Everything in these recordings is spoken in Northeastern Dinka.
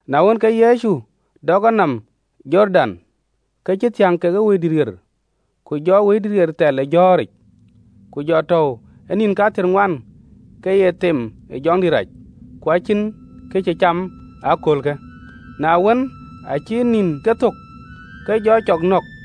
Na wën, ke Yecu dɔk enɔm ë Jordan, ke cï thiäŋ ke Wëidït ɣer, ku jɔ Wëidït thɛl ë jɔ̈ɔ̈ric, ku jɔ tɔ̈u ë nïn kathiërŋuan ë jɔ̈ɔ̈ric, ke ye them ë jɔŋdït rac. Ku acïn kë cï cam ee köölë, na wën, aacï nïnkë thök, ke jɔ cɔk nɔ̈k.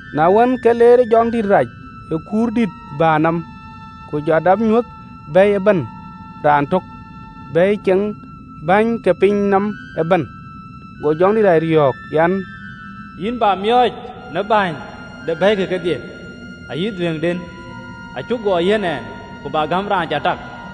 Na wën, ke leerë jɔŋdït rac ë kuurdït bäär nɔm, ku jɔ dap nyuöth bɛ̈i ëbɛ̈n raantök, bɛ̈i ceŋ bäny ke piny nɔm ëbɛ̈n. Go jɔŋdït rac yɔ̈ɔ̈k an, “Yïn bä miɔɔc në bɛ̈ɛ̈ny de bɛ̈ike kedhie, ayï dhuëëŋden: cï guɔ yiɛ̈n Ɛn, ku abä gäm raan cä tak.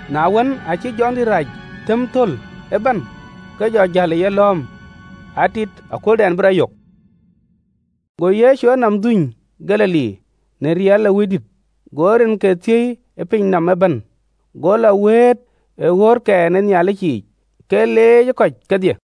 Na wën, aacï jɔŋdït rac thëm thöl ëbɛ̈n, ke jɔ jäl ë yelɔ̈ɔ̈m, atit akööldɛn bï rɔt yök. Go Yecu enɔm dhuöny Galili në riɛl ë Wëidït: go rinke thiëi ë pinyë nɔm ëbɛ̈n. Go lɔ wëët ë ɣöötkɛn ë Nhialic yiic, ke leec ë kɔc kedhie.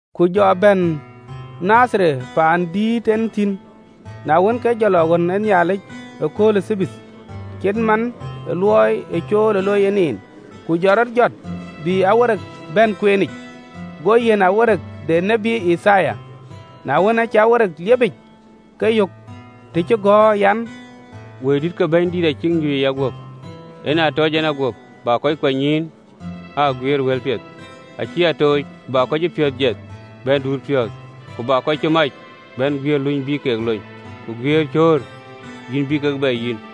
Ku jɔ bɛ̈n Nadhareth, paan ë dïït en thïn: na wën, ke jɔ lɔ ɣön ë Nhialic ëkööl ë Thabath, cït man ë luɔi ee cool ë looi en en, ku jɔ rɔt jɔt bï këcïgɔ̈ɔ̈r bɛ̈n kueenic go yiɛ̈n këcïgɔ̈ɔ̈r de tiët Yithaya. Na wën, aacï këcïgɔ̈ɔ̈r liepic, ke yök të cï gɔ̈ɔ̈r an, (LXX). “Wëidït ke Bɛ̈nydït acïk nyuc ë yaguöp, En aa tɔc en a guöp, bä kɔc kuanynyïïn aa guiëër wëlpiɛth. Acï a tooc bä kɔc cï piɔ̈ɔ̈th jiɛth bɛ̈n duut piɔ̈ɔ̈th, Ku bä kɔc cï mac bɛ̈n guiëër luny bï ke lony, Ku guiëër cöör yïn bï kek bɛ yïn,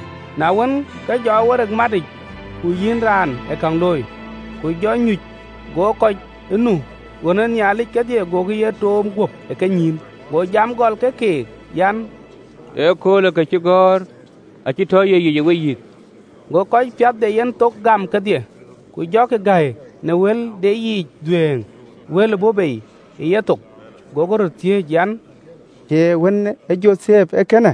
Na wën, ke jɔ këcïgɔ̈ɔ̈r matic, ku yïn raan ë käŋ looi, ku jɔ nyuc, go kɔc ë nu ɣön ë Nhialic kedhie agokï ye toom guöp ë kenyïïn. Go jam gɔl ke keek an, “Köölë këcïgɔ̈ɔ̈rë acï tɔ ye yic ë weyïth.” Go kɔc piath de yenthok gam kedhie, ku jɔkï gäi në wël de yiic dhuëëŋ wël ë bɔ̈ bei ë yethok, gokï röt thiëëc an, “Cie wën ë Jothep?”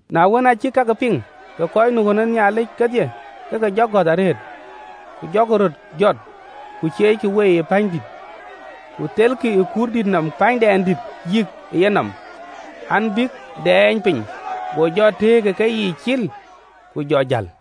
Na wën, aa cïk kakë piŋ, kek kɔc nu ɣön ë Nhialic kedhie, ke ke jɔ gɔ̈th arëët. Ku jɔkï röt jɔt, ku cieeckï wei pänydït, ku thelkï ë kuurdït nɔm kuur cï pänydɛndït yïk ë yenɔm, an, bïk dɛɛny piny. Go jɔ tëëk ë keyiic cil, ku jɔ jäl.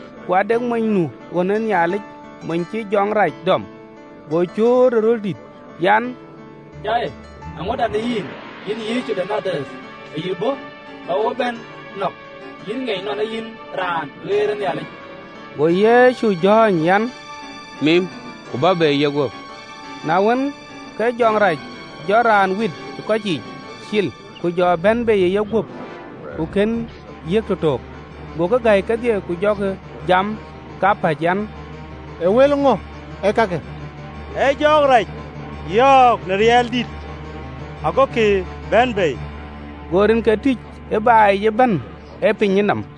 Ku ade mony nu ɣön ë Nhialic, mony cïï jɔŋ rac dɔm, go cööt ë röl dït an, “Cai! Eeŋöda në yïn, yïn Yecu de Nadhareth? Ë yï bɔ̈ bä wo bɛ̈n nɔ̈k? Yïn ŋiɛc nɔn ee yïn Raan ɣeric de Nhialic!” Go Yecu jɔ̈ɔ̈ny an, “Mim, ku bä bei ë yeguöp.” Na wën, ke jɔŋ rac jɔ raan wit ë kɔc yiic cil, ku jɔ bɛ̈n bei ë yeguöp, ku kën yiëk tëtök. Gokï gäi kedhie, ku jɔkï jam kapäc an, “Ee wël ŋö ëkakë? Ee jɔɔk rac yɔ̈ɔ̈k në riɛl dït, agokï bɛ̈n bei!” Go rinke tïc ë baai yic ëbɛ̈n ë pinyë nɔm.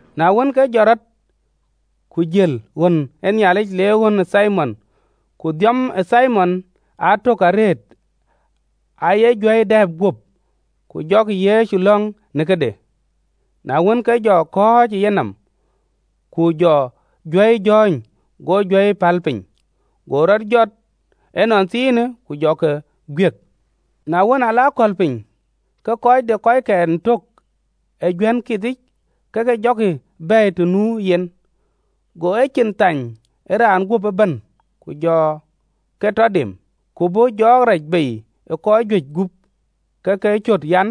Na wën, ke jɔt rɔt, ku jël ɣön ë Nhialic, le ɣön ë Thimon. Ku dhiɔm ë Thimon aa tök arëët aye juäi dɛ̈ɛ̈p guöp, ku jɔkï Yecu lɔ̈ŋ në këde. Na wën, ke jɔ kɔ̈ɔ̈c ë yenɔm, ku jɔ juäi jɔ̈ɔ̈ny, go juäi päl piny, go rɔt jɔt ënɔnthiinë, ku jɔ ke guiëk. Na wën aa lɔ akɔ̈l piny, ke kɔc de kɔckɛn tök ë juän kithic ke ke jɔkï bɛ̈ɛ̈i të nu yen, go ecin thany ë raan guöp ëbɛ̈n, ku jɔ ke tɔ dem. Ku bɔ̈ jɔɔk rac bei ë kɔc juëc gup, ke ke cöt an,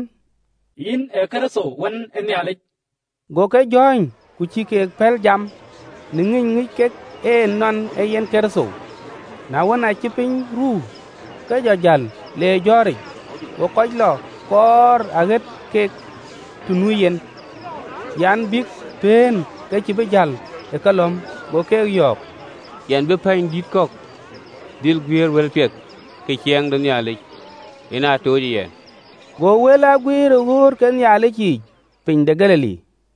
“Yïn ee Kërtho wën ë Nhialic.” Go ke jɔ̈ɔ̈ny, ku cïï ke pɛ̈l jam: në ŋïny ŋic kek en nɔn ee yen Kërtho. Na wën, aacï piny ruu, ke jɔ jäl, le jɔ̈ɔ̈ric: go kɔc lɔ kɔɔr, aɣeet kek të nu yen an, bïk pëën, ke cïï bï jäl ë kelɔ̈m. Go keek yɔ̈ɔ̈k, Yɛn bï pɛ̈ɛ̈nydït kɔ̈k dhil guëër wëlpiɛth ke Ciɛɛŋ de Nhialic: en aa tuucë yɛn. Go wël aa guiir ë ɣööt ke Nhialic yiic piny de Galili.